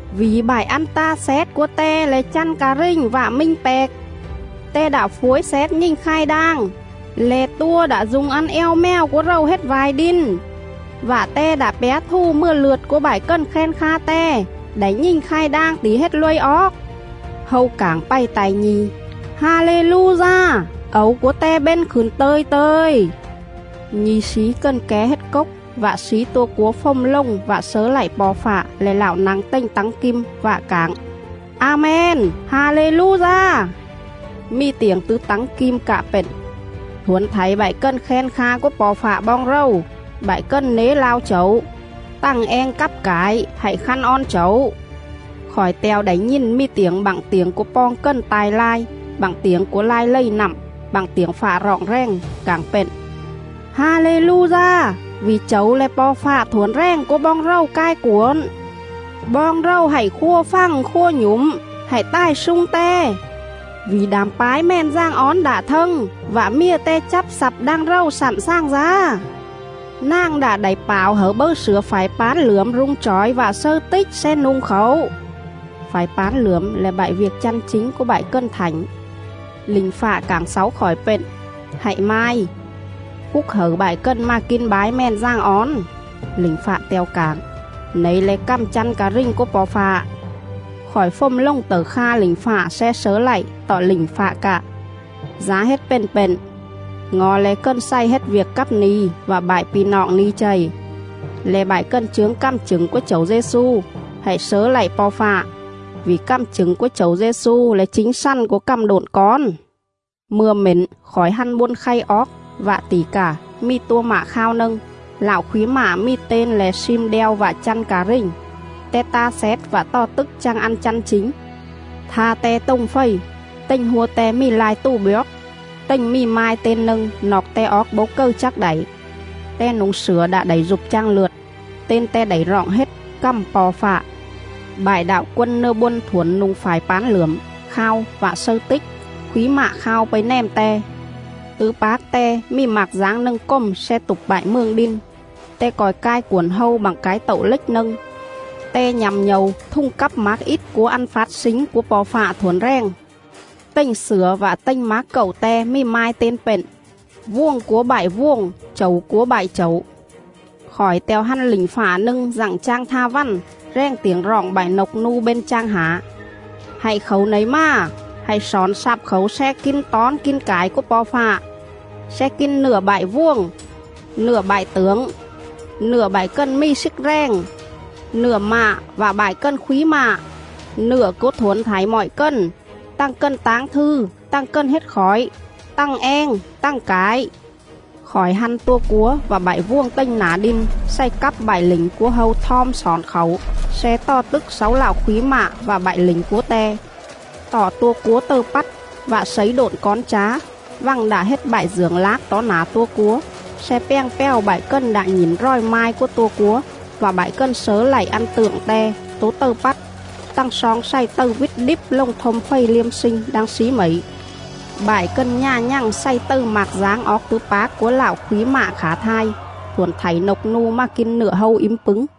Vỉ bại ăn ta xét cúa Te le̱ chăn ca rình vạ minh pẹc. Te đạ phuối xét nhình khai đang, le̱ tua đạ du̱ng ăn eo mèo cúa rầu hết va̱i đin; vạ Te đạ pjá thù mừa lượt cúa bại cần khen kha Te đảy nhình khai đang tỉ hết luây oóc.”. Hâu cảng pày ta̱i nhi̱: “Ha-lê-lu-da! Ẩu cúa te bên khửn tơ̱i tơ̱i!”. Nhi̱ slí cần ké hết cốc vạ slí tua cúa fồm lồng vạ slớ lạy Po̱ Fạ le̱ Lạo nă̱ng tềnh tắng kim, vạ cảng: “A-men! Ha-lê-lu-da!” Mì tiểng tứ tắng kim cạ pện: “Thuổn thảy bại cần khen kha cúa Po̱ Fạ boong rầu, bại cần nế lao Chẩu, tằng eng cắp cải, hạy khăn on Chẩu!”. Khỏi te̱o đảy nhìn mì tiểng bặng tiểng cúa poong cần ta̱i lai, bặng tiểng cúa lai lầy nặm, bặng tiểng fạ roọng rèng, cảng pện: “Ha-lê-lu-da! Vỉ Chẩu le̱ Po̱ Fạ Thuổn Rèng cúa boong rầu cai cuổn.. Boong rầu hạy khua fằng khua nhủm, hạy tài slung Te, vỉ đảm bái Mèn Dàng Ón đạ thâng vạ Mjề Te chắp xặp đang rầu slặn slàng dá. Nàng đạ đảy pảo hẩư bâư slửa phải pán lưởm rung chỏi vạ slâư tích sle nu̱ng khảu!” (phải pán lưởm le̱ bại viêc chăn chính cúa bại cần thảnh). Lỉnh fạ cảng xáu khỏi pện: “Hạy mai: Phúc hẩư bại cần mà kin bái Mèn Dàng Ón!” Lỉnh fạ te̱o cảng: “Nẩy le̱ cằm chăn ca rình cúa Po̱ Fạ.”. Khỏi fồm lồng tẩư kha lỉnh fạ sle slớ lạy, tọ lỉnh fạ cạ: “Dá hết pền pện, ngo̱ le̱ cần xày hết viêc cắp ni̱ vạ bại pi̱ noọng ni̱ chầy, le̱ bại cần chướng cằm chửng cúa Chẩu Dê-xu. Hạy slớ lạy Po̱ Fạ. Vỉ cằm chửng cúa Chẩu Dê-xu le̱ chính xằn cúa cằm độn cón.” Mư̱a mển khỏi hăn bôn khay oóc, vạ tỉ cà, mì tua mạ khao nâng! Lạo khúy mạ mì ten le̱ SLIM ĐEO VẠ CHĂN CA RÌNH; Te ta xét vạ tò tức chang ăn chăn chính.. Tha Te tồng fầy; tềnh hua Te mì lai tù bjoóc, tềnh mì mai ten nâng noọc Te oóc bấu cầư chắc đảy.. Te nu̱ng slửa đạ đảy dụp chang lượt. Ten Te đảy roọng hết CẰM PO̱ FẠ. Bại đạo quân nưa bôn thuổn nu̱ng phải pán lưởm, khao vạ slâư tích, khúy mạ khao pây nèm Te. Tứ pác Te mì mạc dáng nâng cồm sle tụp bại mường đin; Te co̱i cai cuổn hâu bặng cái tậu lếch nâng. Te nhă̱m nhâu thùng cắp mác ít cúa ăn fát slính cúa Po̱ Fạ Thuổn Rèng.. Tềnh slửa vạ tềnh mác cậu Te mì mai ten nâng: VUỒNG CÚA BẠI VUỒNG, CHẨU CÚA BẠI CHẨU. Khỏi te̱o hăn lỉnh fạ nâng dặng chang tha vằn, rèng tiểng roọng bại nộc nu bên chang hả: “Hạy khảu nẩy mà, hạy xỏn xắp khảu sle kin tón kin cải cúa Po̱ Fạ,. sle kin nựa bại vuồng, nựa bại tưởng, nựa bại cần mì slức rèng, nựa mạ vạ bại cần khúy mạ, nựa cúa thuổn thảy mọi cần, tằng cần táng thư tằng cần hết khỏi, tằng eng tằng cải.” Khỏi hăn tua cúa vạ bại vuồng tềnh nả đin xày cắp bại lỉnh cúa hâu thom xỏn khảu sle tò tức xáu Lạo khúy mạ vạ bại lỉnh cúa Te. Tọ tua cúa tầư pắt, vạ slấy độn cón chá — vằng đạ hết bại dưởng lác tó nả tua cúa, sle pjàng pjào bại cần đạ nhỉn ròi mai cúa tua cúa vạ bại cần slớ lạy ăn tượng te — tố tầư pắt. Tằng sloong xày tầư vít đíp lồng thôm fầy liêm slinh đang slí mẩy.. Bại cần nhà nhằng xày tầư mạc dáng oóc tứ pác cúa Lạo khúy mạ khả thai; thuổn thảy nộc nu mà kin nựa hâu ím pứng.